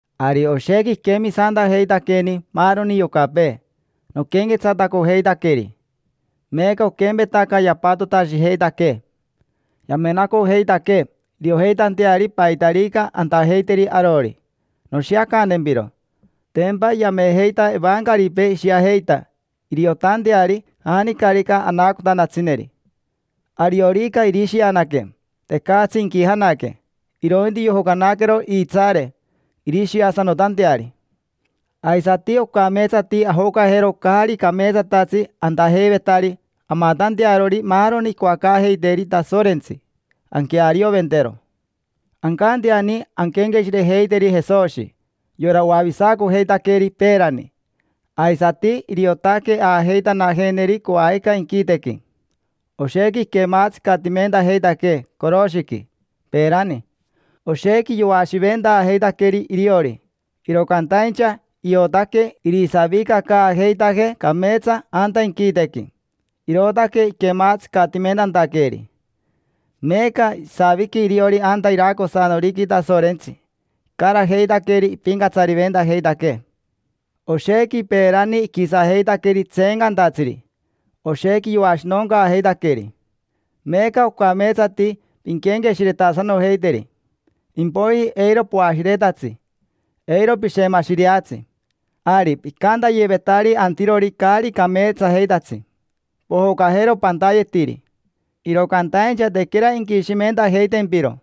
Ari oshequi iquemisantajeitaqueni maaroni yocapee noquenquetsatacojeitaqueri. Meeca oquempetaca yapatotashijeitaquee, yamenacojeitaquee iriojeitanteari paitarica antajeiteri arori. Noshiacantempiro: tempa yamejeita evancaripee ishiajeita iriotanteari janicarica anaacotantatsineri. Ariorica irishianaque, tecatsi inquijanaque, irointi yojocanaquero iitsaare irishiasanotanteari. Aisati ocameetsati ajocajero caari cameetsatatsi antajeivetari amatantearori maaroni icoacaajeiteeri Tasorentsi, anquearioventero. Ancanteani anquenqueshirejeiteri Jesoshi, yora oavisacojeitaqueeri peerani, aisati iriotaque aajeitanajeeneri coajica inquitequi. Oshequi iquematsicatimentajeitaquee coroshiqui peerani, oshequi yoashiventaajeitaqueri iriori. Iro cantaincha iotaque irisavicacaajeitajee cameetsa anta inquitequi, irootaque iquematsicatimentantaqueeri. Meeca isaviqui iriori anta iracosanoriqui Tasorentsi, icarajeitaqueri ipincatsariventajeitaquee. Oshequi peerani iquisajeitaqueri tseencantatsiri, oshequi yoashinoncaajeitaqueri. Meeca ocameetsati pinquenqueshiretasanojeiteri, impoiji eiro poashiretatsi, eiro pishemashireatsi. Ari picantayevetari antirori caari cameetsajeitatsi: “Pojocajero pantayetiri”, iro cantaincha tequera inquishimentajeitempiro.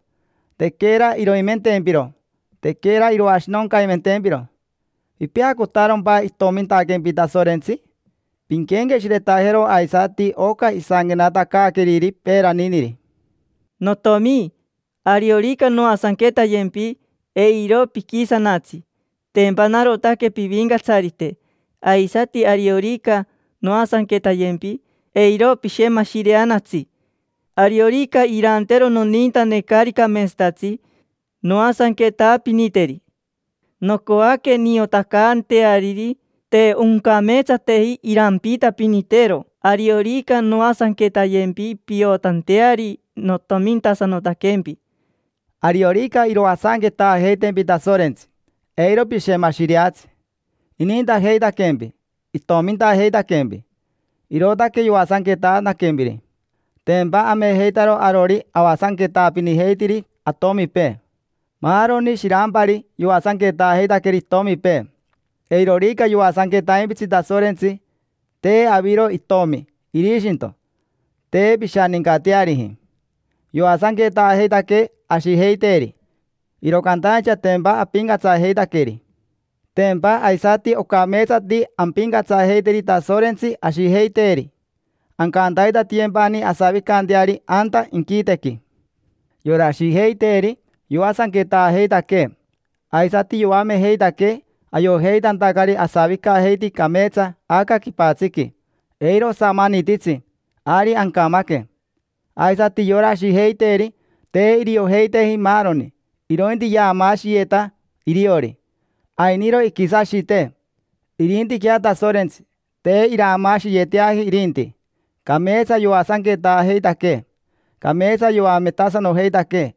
Tequera iroimentempiro, tequera iroashinoncaimentempiro. ¿Pipeacotarompa itomintaquempi Tasorentsi? Pinquenqueshiretajero aisati oca isanquenatacaaqueriri peeraniniri: “Notiomi, ariorica noasanquetayempi, eiro piquisanatsi, tempa narotaque pivincatsarite. Aisati ariorica noasanquetayempi, eiro pishemashireanatsi. Ariorica irantero nonintane caari cameetsatatsi, noasanquetaapiniteri. Nocoaque niotacanteariri te oncameetsateji irampiitapinitero. Ariorica noasanquetayempi piotanteari notomintasanotaquempi”. Ariorica iroasanquetaajeitempi Tasorentsi, eiro pishemashireatsi. Inintajeitaquempi, itomintajeitaquempi, irootaque yoasanquetantaquempiri. Tempa amejeitaro arori avasanquetaapinijeitiri atomipee. Maarori shirampari yoasanquetaajeitaqueri itomipee. Eirorica yoasanquetaimpitsi Tasorentsi, te aviro itomi, irishinto: te pishanincateariji. Yoasanquetaajeitaquee ashijeiteeri, iro cantaincha tempa apincatsajeitaqueri. Tempa aisati ocameetsati ampincatsajeiteri Tasorentsi ashijeiteeri, ancantaitatiyempani asavicanteari anta inquitequi. Yora ashijeiteeri yoasanquetaajeitaquee aisati yoamejeitaquee ayojeitantacari asavicajeiti cameetsa aca quipatsiqui: eiro osamanititsi, ari ancamaque. Aisati yora ashijeiteeri te iriojeiteji maaroni, irointi yaamaashiyeta iriori; ainiro iquisashitee. Irintiquea Tasorentsi, te iraamaashiyeteaji irinti, cameetsa yoasanquetaajeitaquee, cameetsa yoametasanojeitaquee.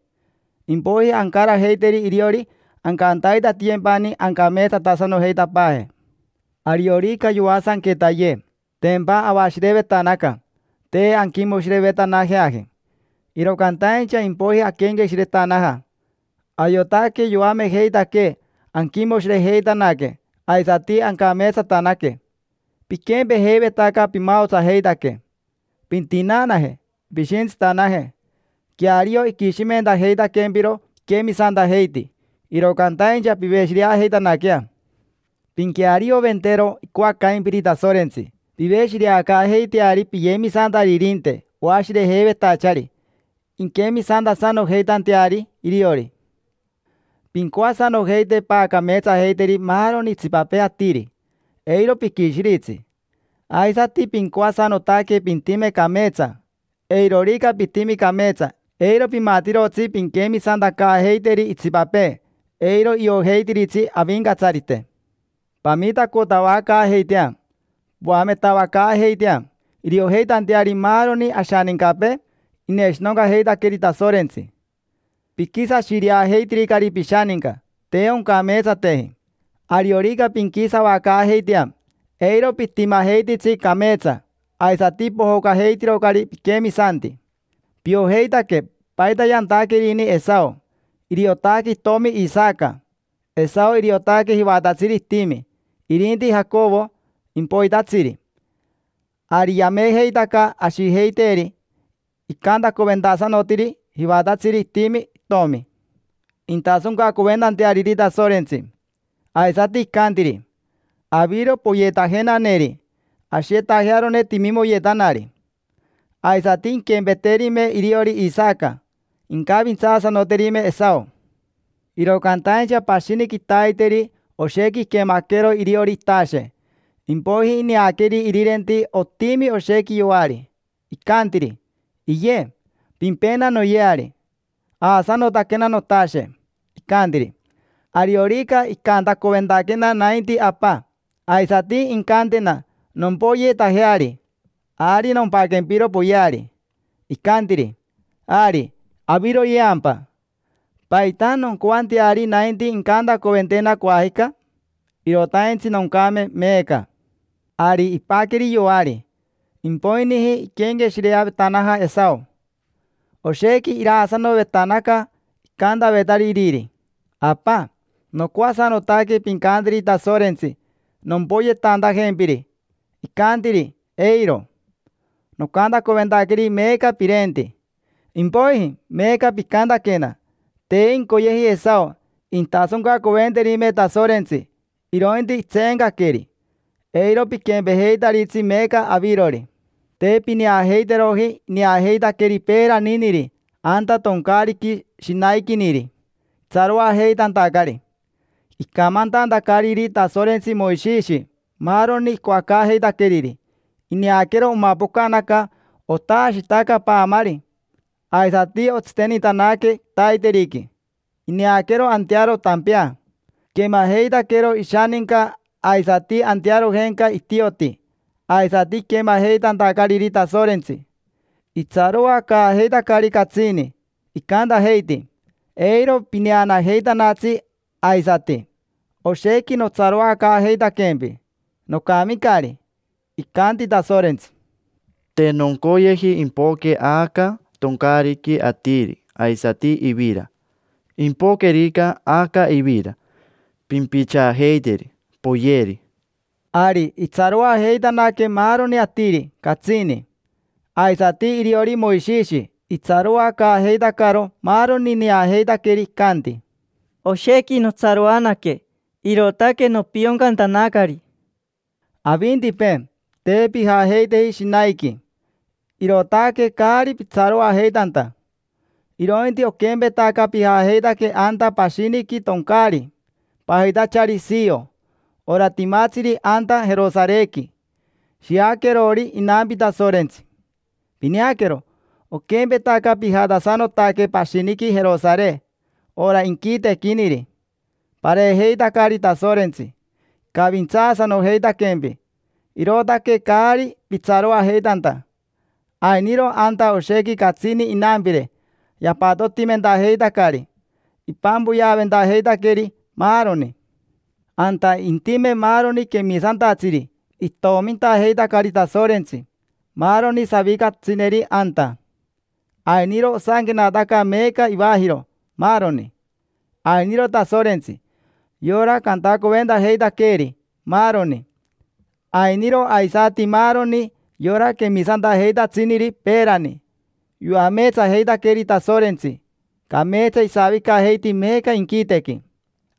Impoiji ancarajeiteri iriori ancantaitatiyempani ancameetsatasanojeitapaaje. Ariorica yoasanquetayee, tempa avashirevetanaca, te anquimoshirevetanajeaji. Iro cantaincha impoiji aquenqueshiretanaja, ayotaque yoamejeitaquee anquimoshirejeitanaque aisati ancameetsatanaque. Piquempejeivetaca pimaotsajeitaque. Pintinaanaje, pishintsitanaje: queario iquishimentajeitaquempiro piquemisantajeiti, iro cantaincha piveshireajeitanaquea. Pinquearioventero icoacaimpiri Tasorentsi. Piveshireacaajeiteari piyemisantaririnte oashirejeivetachari inquemisantasanojeitanteari iriori. Pincoasanojeite paacameetsajeiteri maaroni itsipapee atiri, eiro piquishiritsi. Aisati pincoasanotaque pintime cameetsa: eirorica pitimi cameetsa, eiro pimatirotsi pinquemisantacaajeiteri itsipapee, eiro iojeitiritsi Avincatsarite. Pamitacotavacaajeitea, poametavacaajeitea, iriojeitanteari maaroni ashanincapee ineshinoncajeitaqueri Tasorentsi. Piquisashireajeitiricari pishaninca, te oncameetsateji. Ariorica pinquisavacaajeitea, eiro pitimajeititsi cameetsa, aisati pojocajeitirocari piquemisanti. Piojeitaque paita yantaquerini Esao. Iriotaque itomi Isaca; Esao iriotaque jivatatsiri itimi; irinti Jacovo, impoitatsiri. Ari yamejeitaca ashijeiteeri icantacoventasanotiri jivatatsiri itimi itomi, intasoncacoventanteariri Tasorentsi. Aisati icantiri: “Aviro poyeetajenaneri, ashiyetajearone timimoyetanari”. Aisati inquempeterime iriori Isaca, incavintsaasanoterime Esao. Iro cantaincha pashini quitaiteri oshequi iquemaquero iriori itashe, impoiji ineaqueri irirenti otimi oshequi yoari. Icantiri: “Iye, pimpena noyeari: aasanotaquena notashe”. Icantiri: “Ariorica icantacoventaquena nainti apa, aisati incantena nompoyeetajeari, ari nompaquempiro poyeari”. Icantiri: “Ari, aviroyeampa. ¿Paita noncoanteari nainti incantacoventena coajica? Irotaintsi noncame meeca”. Ari ipaqueri yoari. Impoiniji iquenqueshireavetanaja Esao, oshequi iraasanovetanaca, icantavetari iriri: “Apa, nocoasanotaque pincanteri Tasorentsi nompoyetantajempiri”. Icantiri: “Eiro. Nocantacoventaqueri meeca pirenti. Impoiji meeca picantaquena”. Te incoyeji Esao intasoncacoventerime Tasorentsi, irointi itseencaqueri. Eiro piquempejeitaritsi meeca avirori. Te pineajeiteroji ineajeitaqueri peeraniniri anta toncaariqui shinaiquiniri, itsaroajeitantacari. Icamantantacariri Tasorentsi Moishishi maaroni icoacaajeitaqueriri, ineaquero omapocanaca otaashitaca paamari, aisati otsitenitanaque quitaiteriqui, ineaquero antearo tampea. Iquemajeitaquero ishaninca aisati antearojenca itioti aisati iquemajeitantacariri Tasorentsi, itsaroacaajeitacari catsini, icantajeiti: “Eiro pineanajeitanatsi aisati, oshequi notsaroacaajeitaquempi. Nocamicari”. Icanti Tasorentsi: “Te noncoyeji impoque aca toncaariqui atiri aisati ivira. Impoquerica aca ivira, pimpichaajeiteri, poyeri”. Ari itsaroajeitanaque maaroni atiri, catsini. Aisati iriori Moishishi, itsaroacaajeitacaro maaroni ineajeitaqueri; icanti: “Oshequi notsaroanaque, irootaque nopioncantanacari”. Avintipee, te pijajeiteji Shinaiqui, irootaque caari pitsaroajeitanta. Irointi oquempetaca pijajeitaque anta pashiniqui toncaari, pajitachari Sio, ora timatsiri anta Jerosarequi: shiaquerori inampi Tasorentsi. Pineaquero, oquempetaca pijatasanotaque pashiniqui Jerosare, ora inquitequiniri: pareejeitacari Tasorentsi, icavintsaasanojeitaquempi, irootaque caari pitsaroajeitanta. Ainiro anta oshequi catsini inampire, yapatotimentajeitacari, ipampoyeaventajeitaqueri, maaroni. Anta intime maaroni quemisantatsiri itomintajeitacari Tasorentsi, maaroni savicasanotatsineri anta: ainiro osanquenataca meeca ivajiro, maaroni. Ainiro Tasorentsi, yora cantacoventajeitaqueeri, maaroni. Ainiro aisati maaroni yora quemisantajeitatsiniri peerani; yoameetsajeitaqueri Tasorentsi, cameetsa isavicajeiti meeca inquitequi.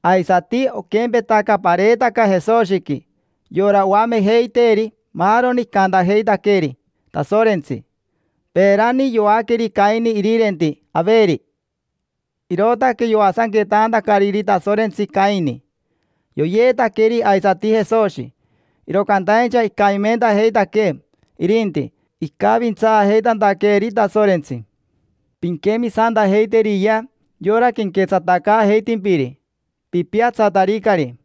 Aisati oquempetaca pareetaca Jesoshiqui, yora oamejeiteeri maaroni icantajeitaqueri Tasorentsi. Peerani yoaqueri Caini irirenti Averi, irootaque yoasanquetaantacariri Tasorentsi Caini. Yoyeetaqueri aisati Jesoshi, iro cantaincha icamimentajeitaquee irinti, icavintsaajeitantaqueeri Tasorentsi. Pinquemisantajeiteriyea yora quenquetsatacaajeitimpiri, pipiatsataricari.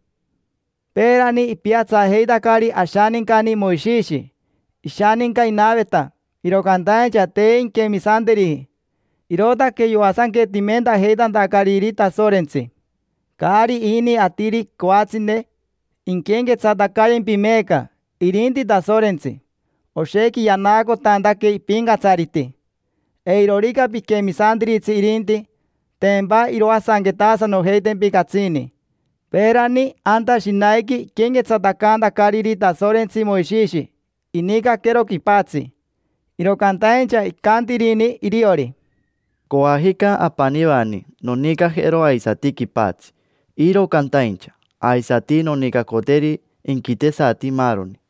Peerani ipiatsajeitacari ashanincani Moishishi. Ishaninca inaveta, iro cantaincha te inquemisanteriji, irootaque yoasanquetimentajeitantacariri Tasorentsi. Caari ini atiri coatsine inquenquequetsatacayempi meeca, irinti Tasorentsi. Oshequi yanaacotantaque ipincatsariti. Eirorica piquemisantiritsi irinti, tempa iroasanquetasanojeitempi catsini. Peerani anta Shinaiqui iquenquetsatacantacariri Tasorentsi Moishishi, inicaquero quipatsi. Iro cantaincha icantirini iriori: “Coajica apanivani nonicajero aisati quipatsi, iro cantaincha aisati nonicacoteri inquitesati maaroni”.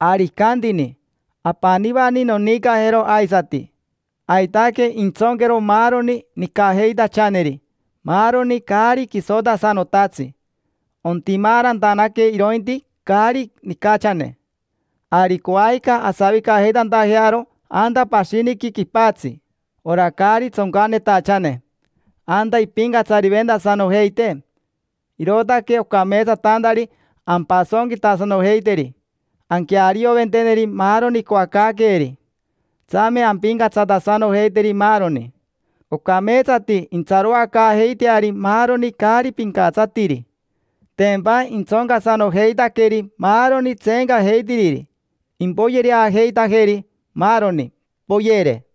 Ari icantini: “Apanivani nonicajero aisati”. Aitaque intsonquero maaroni nicajeitachaneri, maaroni caari quisotasanotatsi. Ontimaarantanaque irointi caari nicachane. Ari coajica asavicajeitantajearo anta pashiniqui quipatsi, ora caari tsoncanetachane: anta impincatsariventasanojeitee. Irootaque ocameetsatantari ampasonquitasanojeiteri, anquearioventeneri maaroni icoacaaqueeri; tsame ampincatsatasanojeiteri maaroni. Ocameetsati intsaroacaajeiteari maaroni caari pincatsatiri, tempa intsoncasanojeitaqueri maaroni tseecajeitiriri, impoyereajeitajeri, maaroni: poyere.